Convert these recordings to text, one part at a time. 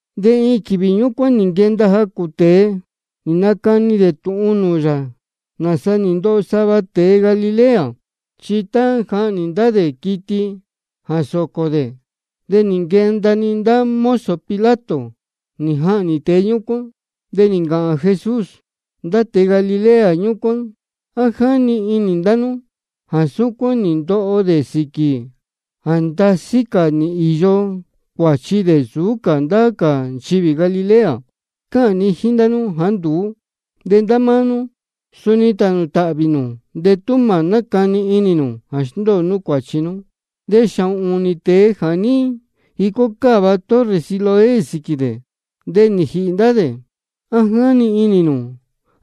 De iin quīvī ñúcuán nī nquenda jacū tēe, nī nacani dē tūhun nūū yā nāsa nī ndoho sava tēe Galilea. Chi tá jáhnī ndá dē quiti jā sōcō dē, de nī nquenda-ni ndá mozo Pilato nī jahnī tēe ñúcuán. De nī ncāhān Jesús: Ndá tēe Galilea ñúcuán, ¿á jáni inī ndá nú jā súcuán nī ndoho dē sīquī jā ndasí cā nī īyo cuāchi dē nsūú cā ndá cā nchivī Galilea? Cáhān ni jíín ndá nú jāá nduú. De ndá máá nú suni tānū tāhvī nū de tú mā nácani inī nū jā sndóo nú cuāchi nú. De xāhōn ūnī tēe jā ní jicó cáva torre Siloé sīquī dē, de nī jīhī ndá dē, ¿á jáni inī nū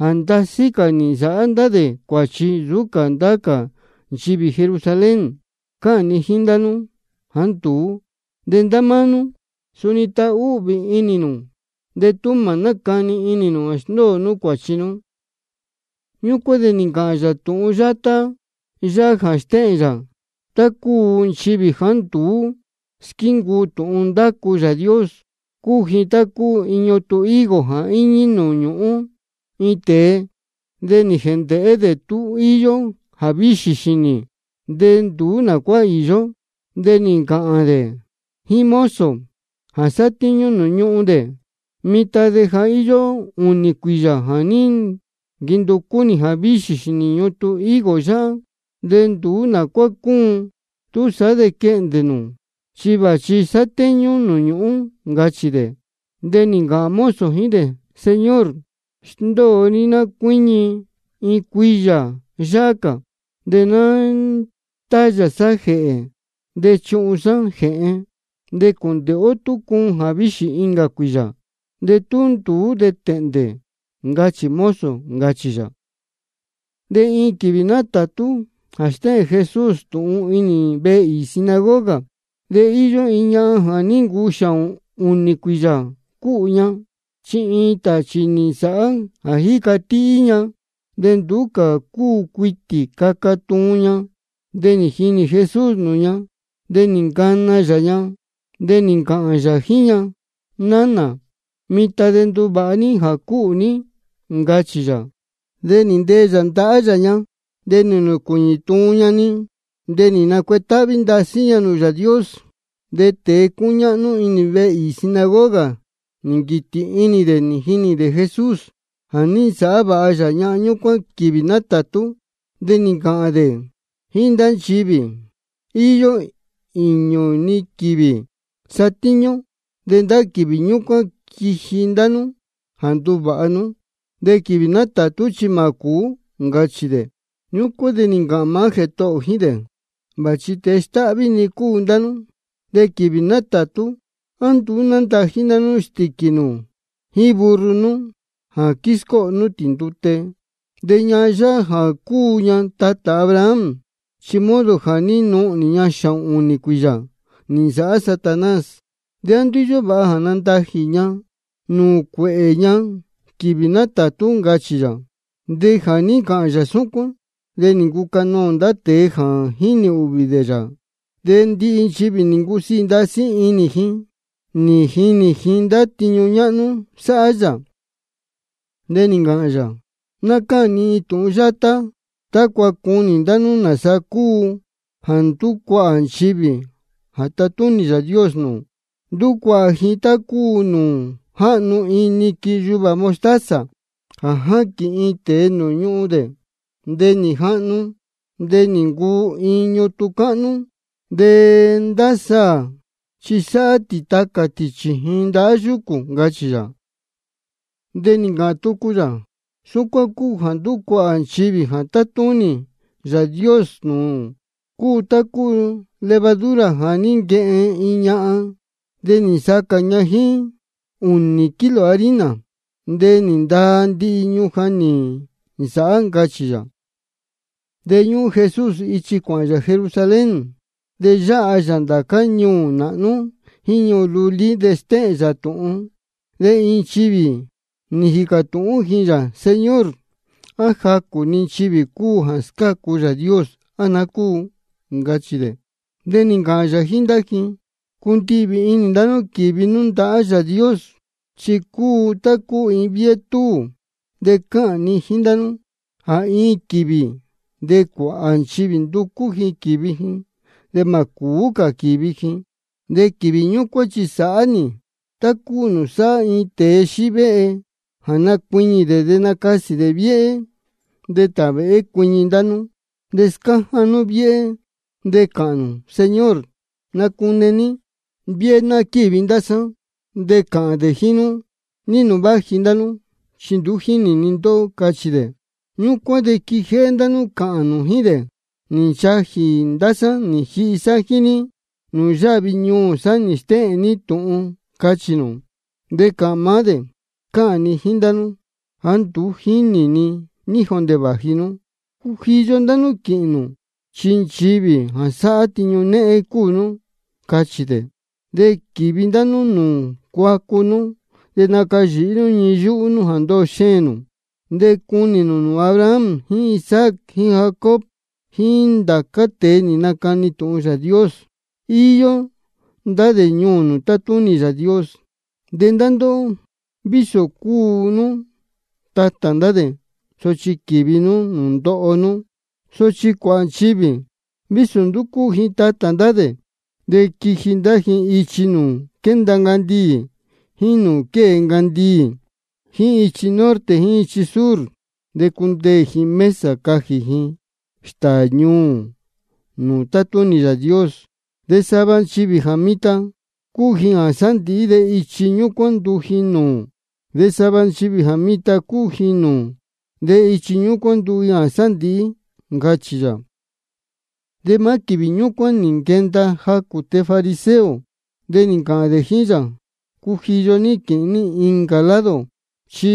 jā ndasí cā nī nsāhá ndá dē cuāchi nsūú cā ndá cā nchivī Jerusalén? Cáhān ni jíín ndá nú jāá nduú. De ndá máá nú suni tānū tāhvī nū de tú mā nácani inī nū jā sndóo nú cuāchi nú. Ñúcuán de nī ncāhān yā tūhun yátá yáhá jā stéhēn yā tá cúu nchivī jāá nduú squíncuu tūhun ndácu Yāā Dios: Cúu ji tá cúu iin ñutun higo jā íñí nūū ñuhun iin tēe. De nī jēndēhé dē tú íyó jāvíxī xīnī, de nduú nā cuá īyó. De nī ncāhān dē jíín mozo jā sátíñú nūū ñuhun dē: Mitan de ja íyó ūnī cuīyā jā quínducú nī jāvíxī xīnī ñutun higo yáhá, de nduú nā cuá cúun. Túsaá de quehndē nū, chi vāchi sátéñú nūū ñūhún, ncachī dē. De nī ncāhān mozo jíín dē: Señor, sndóo ní ná cuíñi iin cuīyā yāhá cā, de ná nástáyā sá jēhē de chuhun sá jēhen. De cūndēhé ó tú cuun jāvíxī incā cuīyā. De tú nduú, de tēhndē, ncachī mozo, ncachī yā. De iin quīvī nátātú de stéhēn Jesús tūhun inī vehe īī sinagoga. De íyó iin ñahan jā ní ncuu xāhōn ūnī cuīyā cúhū ña. Chi iin tāchī nī nsāhá jā jíca tihí ña, de nduú cā cúu cuitī caca tuun ña. De nī jinī Jesús nūū ña, de nī ncana yā ña, de nī ncāhān yā jíín ña: Nánā, mitan de nduvāha ní jā cúhū ní, ncachī yā. De nī ntee yā ndahá yā ña, de nī nūcuīñī tuun ña-ni, de nī nacuetáhví ndasí ña nūū Yāā Dios. De tēe cúñáhnú inī vehe īī sinagoga, nī nquītī inī dē nī jinī dē Jesús jā ní nasāhá vāha yā ñahan ñúcuán quīvī nátātú. De nī ncāhān dē jíín ndá nchivī: Iyó īñū-ni quīvī sátíñú ó, de ndá quīvī ñúcuán quiji ndá nú jā nduvāha nú. De quīvī nátātú chi mā cūú, ncachī dē. Ñúcuán de nī ncāhān maá Jētohō ō jíín dē: Vāchi tēe stáhví-ni cúu ndá nú. De quīvī nátātú, ¿á nduú nándají ndá nú stīquī nū jíín burro nú jā quíscóho nú tī ndute? De ñahan yáhá jā cúu ña tatā Abraham, chi modo jā ní nuhnī ña xāhōn ūnī cuīyā nī nsāhá Satanás. ¿De á nduú íyó vāha jā ní nandají nī ña nūū cuēhē ña quīvī nátātú? ncachī yā. De jā ní ncāhān yā súcuán, de nī ncucanoō ndá tēe jā jínī ūhvī dē yā. De ndihi nchivī nī ncusiī ndasí inī ji nī jinī ji ndá tiñu ñáhnú sáhá yā. De nī ncāhān yā: Ná cáhān ni iin tūhun yátá tácua cunī ndá nú nāsa cúu jā ndúcuahā nchivī jā tátúnī Yāā Dios nūū. Ndúcuahā ji tá cúu nūū jáhnu iin niquin yuvā mostaza jā ní jaquīn iin tēe nūū ñuhun dē. De nī jahnu, de nī ncuu iin ñutun cáhnú, de ndá saā chi sáhá tī tacā tī chījin ndahá yúcū, ncachī yā. De nī ncāhān tucu yā: Súcuán cúu jā ndúcuahā nchivī jā tátúnī Yāā Dios nūū: Cúu tá cúu levadura jā ní nquehen iin ñahan, de nī nsacā ña jíín ūnī kilo harina, de nī ndaa ndihi ñujan nī nsāhá, ncachī yā. De ñúhún Jesús ichi cuāhān yā Jerusalén, de yáha yā ndācá ñuū nāhnú jíín ñuū lulí, de stéhēn yā tūhun. De iin nchivī nī jīcā tūhún ji yā: Señor, ¿á jacū-ni nchivī cúu jā scácu Yāā Dios, á naá cúu? ncachī dē. De nī ncāhān yā jíín ndá ji: Cundihvī inī ndá nú quīvi nú ndahá Yāā Dios. Chi cúu tá cúu iin viéhé túū. De cáhān ni jíín ndá nú jā iin quīvī de cuāhā nchivī nducú ji quīvi ji, de mā cūú cā quīvi ji. De quīvī ñúcuán chi sāhá nī tá cúu nūū sáhá iin tēe xívéhe, jā nacuiñī dē de nacasī dē viéhé. De tāvēhé cuiñi ndá nú, de scáján nú viéhé, de cāhān nū: Señor, nacune ní viéhé ná quívi ndá sá. De cāhān dē jíín nú: ¿Ní nūū vāji ndá nú? Chi nduú jínī ni ndóhó, cachī dē. Ñúcuán de quijéhé ndá nú cāhān nū jíín dē: Nī nchajī ndá sá nī jihi sá jíín ní, de nūū yáhvi ñuū sá nī stéhēn ní tūhun, cachī nū. De cāhān maá dē: Cáhān ni jíín ndá nú jāá nduú jínī ni ní jondē vāji nú. Cujiyo ndá nú quīhīn nū, chi nchivī jā sáhá tiñu néhén cúu nú, cachī dē. De quīvi ndá nú nūū cuacu nú de nacayīhí nú ñii yúhú nú jā ndoho xēēn nū. De cunī nū nūū Abraham jíín Isaac jíín Jacob jíín ndācá tēe nī nacani tūhun Yāā Dios, íyó ndá dē ñuū nūū tátúnī Yāā Dios. De ndá ndóhó, vísō cúu nú tatā ndá dē, sochi quīvi nú nūū ndoho nú. Sochi cuāhā nchivī, vísō nduú cúu ji tatā ndá dē, de quiji ndá ji ichi nūū quénda ncandiī jíín nūū quée ncandiī, jíín ichi norte jíín ichi sur. De cundeē ji mesa jā cajī ji stāā ñuū nūū tátúnī Yāā Dios. De sava nchivī jā mitan cúu ji jā sándīhí, de ichi ñúcuán nduu ji nūū. De sava nchivī jā mitan cúu ji nūū, de ichi ñúcuán nduu ji jā sándīhí, ncachī yā. De maá quīvī ñúcuán nī nquenda jacū tēe fariseo, de nī ncāhān dē jíín yā: Cujiyo ní quīhīn ní incā lado, chi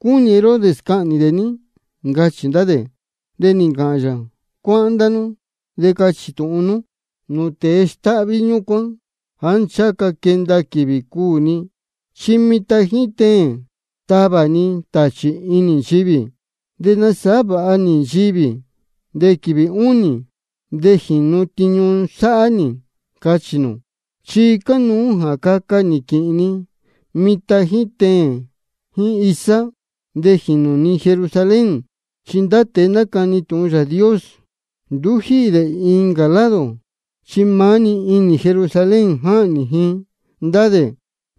cúnī Herodes cahnī dē ní, ncachī ndá dē. De nī ncāhān yā: Cuáhán ndá nú de cachī tūhun nú nūū tēe stáhví ñúcuán jāá ncháha ca quenda quīvī cuū ni, chi mitan jíín teēn tavā ni tāchī inī nchivī, de nasāhá vāha nī nchivī. De quīvī únī de jīnu tiñu sáhá nī, cachī nū. Chi cánuú jā caca nī quīhīn ni mitan jíín teēn jíín isá, de jīnū ni Jerusalén. Chi ndá tēe nácani tūhun Yāā Dios, nduú jíhī dē incā lado, chi maá-ni inī Jerusalén jáhnī ji ndá dē.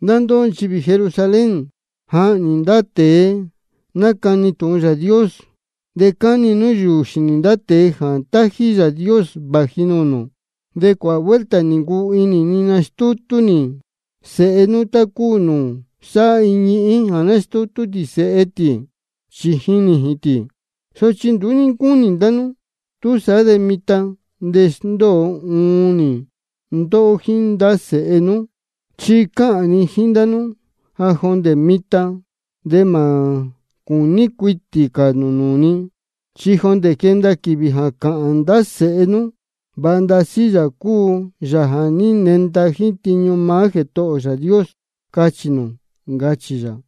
Ndá ndóhó nchivī Jerusalén, jáhnī nū ndá tēe nácani tūhun Yāā Dios, de cáni nú yūū xīnī ndá tēe jā tájí Yāā Dios vāji nūū nū. De cuāhā vuelta nī ncuu inī ni nastútú nī sēhe nú, tá cúu nūū sáhá iin ñihín jā nástútú tī sēhe tī chījin nījīn tī, sochi nduú ní ncúnī ndá nú. Túsaá de mitan de sndóo uun nī ndóhó jíín ndá sēhe nú. Chi cáhān ni jíín nú jā jondē mitan de mā cūní cuitī cā nū nūū ni, chi jondē quenda quīvī jā cāhān ndá sēhe nú: Vāha ndasí Yāā cúu Yāā jā ní nenda jíín tiñu maá Jētohō ō Yāā Dios, cachī nū, ncachī yā.